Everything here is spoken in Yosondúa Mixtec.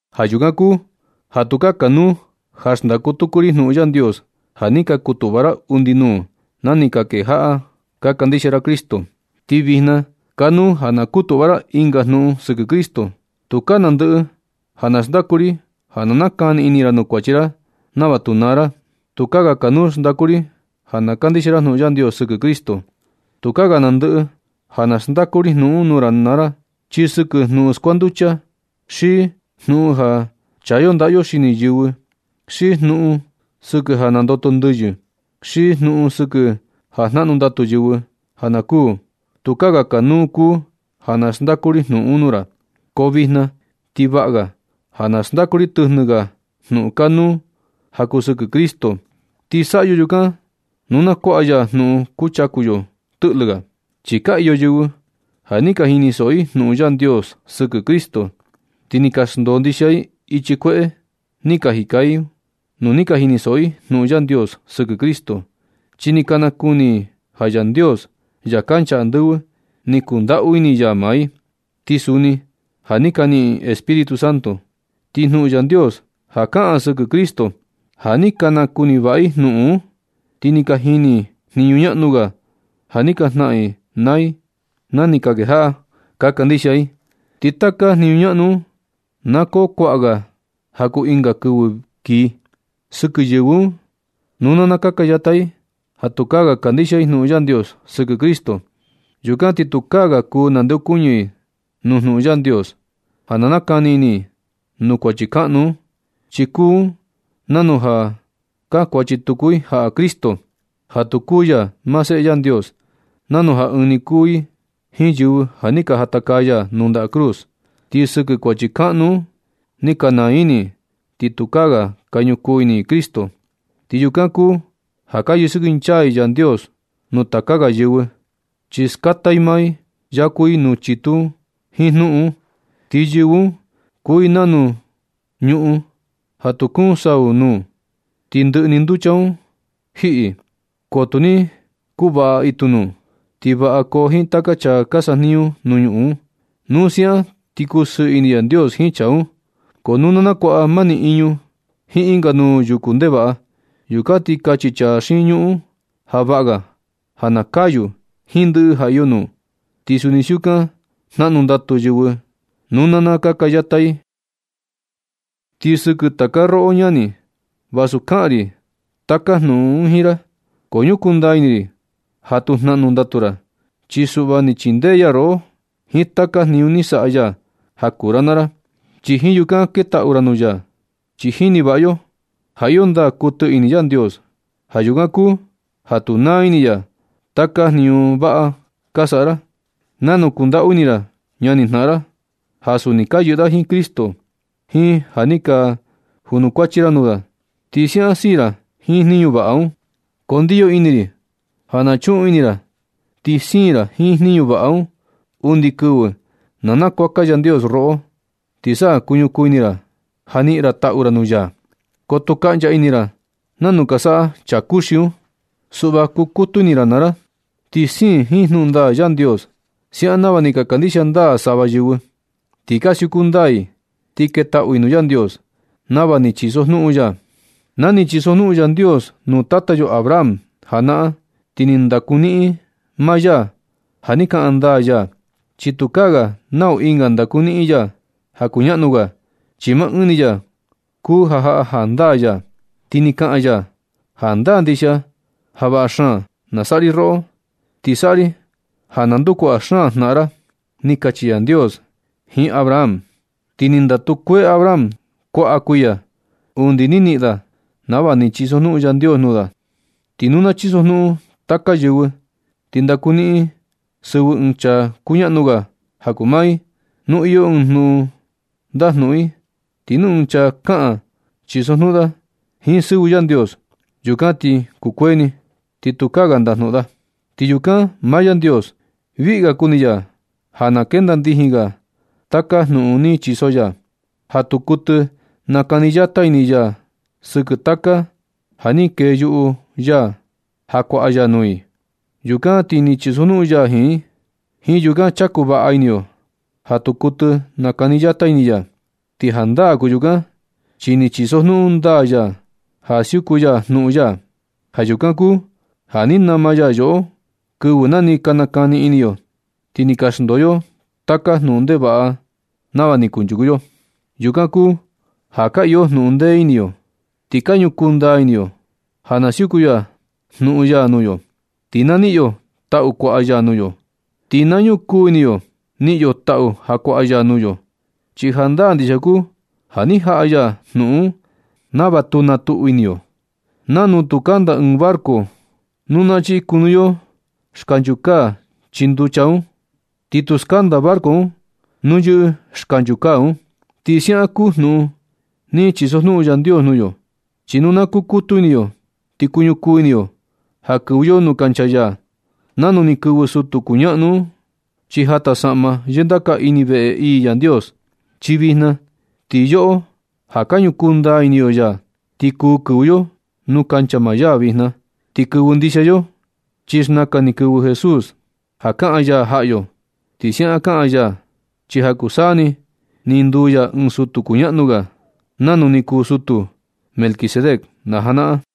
Ja yukan kuu ja tukaa kanuu ja xndaku tuku ri jnuꞌun Yandios ja ni ka kutuꞌva ra undi nuu na ni ka kejaꞌa ka kandixia ra Cristo. Ti vijna kanuu ja na kutuꞌva ra ɨnga jnuꞌun sɨkɨ Cristo. Tukaa nandɨꞌɨ ja na xndaku ri ja na nakani ini ra nuu kuachi ra nava tu naa ra. Tukaa ga kanuu xndaku ri ja na kandixia ra jnuꞌun Yandios sɨkɨ Cristo. Tukaa ga nandɨꞌɨ ja na xndaku ri jnuꞌun un nuu ra naa ra, xi sɨkɨ jnuꞌun skuanducha, xi jnuꞌun ja chaa yo ndaꞌa yo xini yɨvɨ, xi jnuꞌun sɨkɨ ja nandoto ndɨyɨ, xi jnuꞌun sɨkɨ ja jnaꞌnu ndatu yɨvɨ ja kuu. Tukaa ga kanuu kuu ja na xndaku ri jnuꞌun un nuu ra. Ko vijna ti vaꞌa ga ja na xndaku ri tɨjnɨ ga jnuꞌun kanuu ja kuu sɨkɨ Cristo. Ti saꞌa yo yukan nu na kuaꞌa ya jnuꞌun kuchaku nuu yo tɨꞌlɨ ga. Chi ka iyo yɨvɨ ja ni ka jinisoꞌo i jnuꞌun Yandios sɨkɨ Cristo. Ti ni ka xndoo ndixia i ichi kueꞌe ni ka jika i un nu ni ka jinisoꞌo i jnuꞌun Yandios sɨkɨ Cristo, chi ni ka nakuni i ja Yandios, Ya kancha andɨvɨ, ni kundaꞌu ini ya maa i. Ti suni ja ni ka niꞌin i Espíritu Santo. Ti jnuꞌun Yandios ja kaꞌan sɨkɨ Cristo, ja ni ka nakuni vaꞌa i jnuꞌun un, ti ni ka jini i jniñu ñaꞌnu ga ja ni ka jnaꞌan i naa ni ka kejaꞌa ka kandixia i. Ti taka jniñu ñaꞌnu un na koo kuaꞌa ga ja kuu ɨnga kɨvɨ kii. Ti sɨkɨ yɨvɨ un, nu na nakaka yata i ja tukaa ga kandixia i jnuꞌun Yandios sɨkɨ Cristo, yukan ti tukaa ga kuu nandeokuñɨ i nuu jnuꞌun Yandios ja na nakani ini i nuu kuachi kaꞌnu un, chi kuu un nanu ja kankuachi tuku i jaꞌa Cristo ja tu kuu ya maa Seꞌe Yandios, nanu ja ɨɨn ni kuu i jiin yɨvɨ ja ni ka jatakaa ya nuu nda cruz. Ti sɨkɨ kuachi kaꞌnu un ni ka naa ini i ti tukaa ga ka ñukuu ini i Cristo, ti yukan kuu ja ka yɨsɨkɨnchaa i Yandios nuu taka ga yɨvɨ, chi skata i maa i yaku i nuu chitu un jiin jnuꞌun un. Ti yɨvɨ un kuu i nanu ñuꞌun ja nu kuun sau nuu ti ndɨꞌɨ ni nducha un jiꞌi. Ko nu ni kuvaꞌa itu nuu, ti vaꞌa koo jiin taka chaa ka sajniñu nuu ñuꞌun un. Nu siaꞌan ti kusɨɨ ini Yandios jiin chaa un. Ko nu nakuaꞌa mani iñu jiin ɨnga nuu yuku ndevaꞌa, yukan ti kachi chaa xiin ñuꞌun un ja vaꞌa ga na kayu jiin ndɨꞌɨ ja iyo nuu. Ti suni siukan jnaꞌnu ndatu yɨvɨ nu na nakaka yata i. Ti sɨkɨ taka roꞌo ñani, vasu kaꞌan ri taka jnuꞌun un jiin ra, ko ñukuu ndaa ini ri ja tu jnaꞌnu ndatu ra. Chi suꞌva ni chindee ya roꞌo jiin taka jniñu ni saꞌa ya ja kuu ra naa ra, ti jiin yukan ketaꞌu ra nuu ya. Chi jini vaꞌa yo ja iyo ndaa kuɨtɨ ini Yandios. Ja yukan kuu ja tu naa ini ya taka jniñu vaꞌa ka saꞌa ra, nanu kundaꞌu ini ra ñani jnaꞌan ra, ja suni ka yɨꞌɨ da jiin Cristo, jiin ja ni ka junukuachi ra nuu da, ti siaꞌan siin ra jiin jniñu vaꞌa un. Ko ndiyo ini ri ja na chuꞌun ini ra ti siin ra jiin jniñu vaꞌa un undi kɨvɨ na nakuaka Yandios roꞌo, ti sa kuñukuu ini ra ja niꞌin ra taꞌu ra nuu ya. Ko tu kaꞌncha ini ra nanu ka saꞌa chaa kuxi un. Suꞌva kukutu ini naa ra ti siin jiin jnuꞌun ndaa Yandios siaꞌan nava ni ka kandixia ndaa sava yɨvɨ, ti ka siuku ndaa i, ti ketaꞌu i nuu Yandios nava ni chiso jnuꞌun ya. Na ni chisojnuꞌun Yandios nuu tata yo Abraham janaꞌan, ti ni ndakuniꞌin ya maa ya ja ni kaꞌan ndaa ya, chi tukaa ga nau ɨnga ndakuniꞌin ya ja kuñaꞌnu ga, chi maa ɨɨn ni ya kuu ja jaꞌa jandaa ya. Ti ni kaꞌan ya: “Jandaa ndixia ja vaꞌa xaan na saꞌa ri roꞌo, ti saꞌa ri ja na ndukuaꞌa xaan jnaꞌan ra”, ni kachi Yandios jiin Abraham. Ti ni ndatu kuee Abraham kuaꞌa kuiya undi ni niꞌin da nava ni chisojnuꞌun Yandios nuu da. Ti nu na chisojnuꞌun taka yɨvɨ, ti ndakuniꞌin i sɨvɨ ɨɨn chaa kuñaꞌnu ga ja kuu maa i. Nu iyo ɨɨn jnuꞌun ndajnuꞌun i, ti nu ɨɨn chaa kaꞌan chisojnuꞌun da jiin sɨvɨ Yandios, yukan ti kukuee ni, ti tukaa ga ndajnuꞌun da. Ti yukan maa Yandios, viꞌi ga kuni ya ja na kenda ndijin ga taka jnuꞌun ni chiso ya, ja tu kuɨtɨ nakani yata ini ya sɨkɨ taka ja ni keyuꞌu ya ja kuaꞌa ya nuu i. Yukan ti ni chisojnuꞌun ya jiin i. Jiin yukan chaku vaꞌa ini yo ja tu kuɨtɨ nakani yata ini ya. Ti jandaa kuu yukan chi ni chisojnuꞌun ndaa ya ja siuku ya jnuꞌun ya. Ja yukan kuu ja ni nama ya yoꞌo kɨvɨ na ni ka nakani ini yo, ti ni ka xndoo yo taka jnuꞌun ndevaꞌa nava ni kunchuku yo. Yukan kuu ja ka iyo jnuꞌun ndee ini yo. Ti ka ñukuu ndaa ini yo ja na siuku ya jnuꞌun ya nuu yo, ti na niꞌin yo taꞌu kuaꞌa ya nuu yo. Ti ka ñukuu ini yo niꞌin yo taꞌu ja kuaꞌa ya nuu yo. Chi jandaa ndixia kuu ja ni jaꞌa ya jnuꞌun un nava tu na tuꞌu ini yo, nanu tu kanda ɨɨn barco nu na chiꞌi kunu yo ancla chii nducha, ti tu skanda barco un nu yɨꞌɨ ancla un. Ti siaꞌan kuu jnuꞌun ni chisojnuꞌun Yandios nuu yo. Chi nu na kukutu ini yo ti kuñukuu ini yo ja kɨvɨ yo nuu kancha ya, nanu ni kɨvɨ sutu kuñaꞌnu un ichi jata saꞌma yɨndaka ini veꞌe ii Yandios. Chi vijna ti yoꞌo ja ka ñukuu ndaa ini yo ya, ti kuu kɨvɨ yo nuu kancha maa ya vijna. Ti kɨvɨ ndixia yo, chi xnakan ni kɨvɨ Jesús ja kaꞌan ya jaꞌa yo. Ti siaꞌan kaꞌan ya, chi ja kuu saa ni ni nduu ya ɨɨn sutu kuñaꞌnu ga, nau ni kuu sutu Melquisedec najanaꞌan.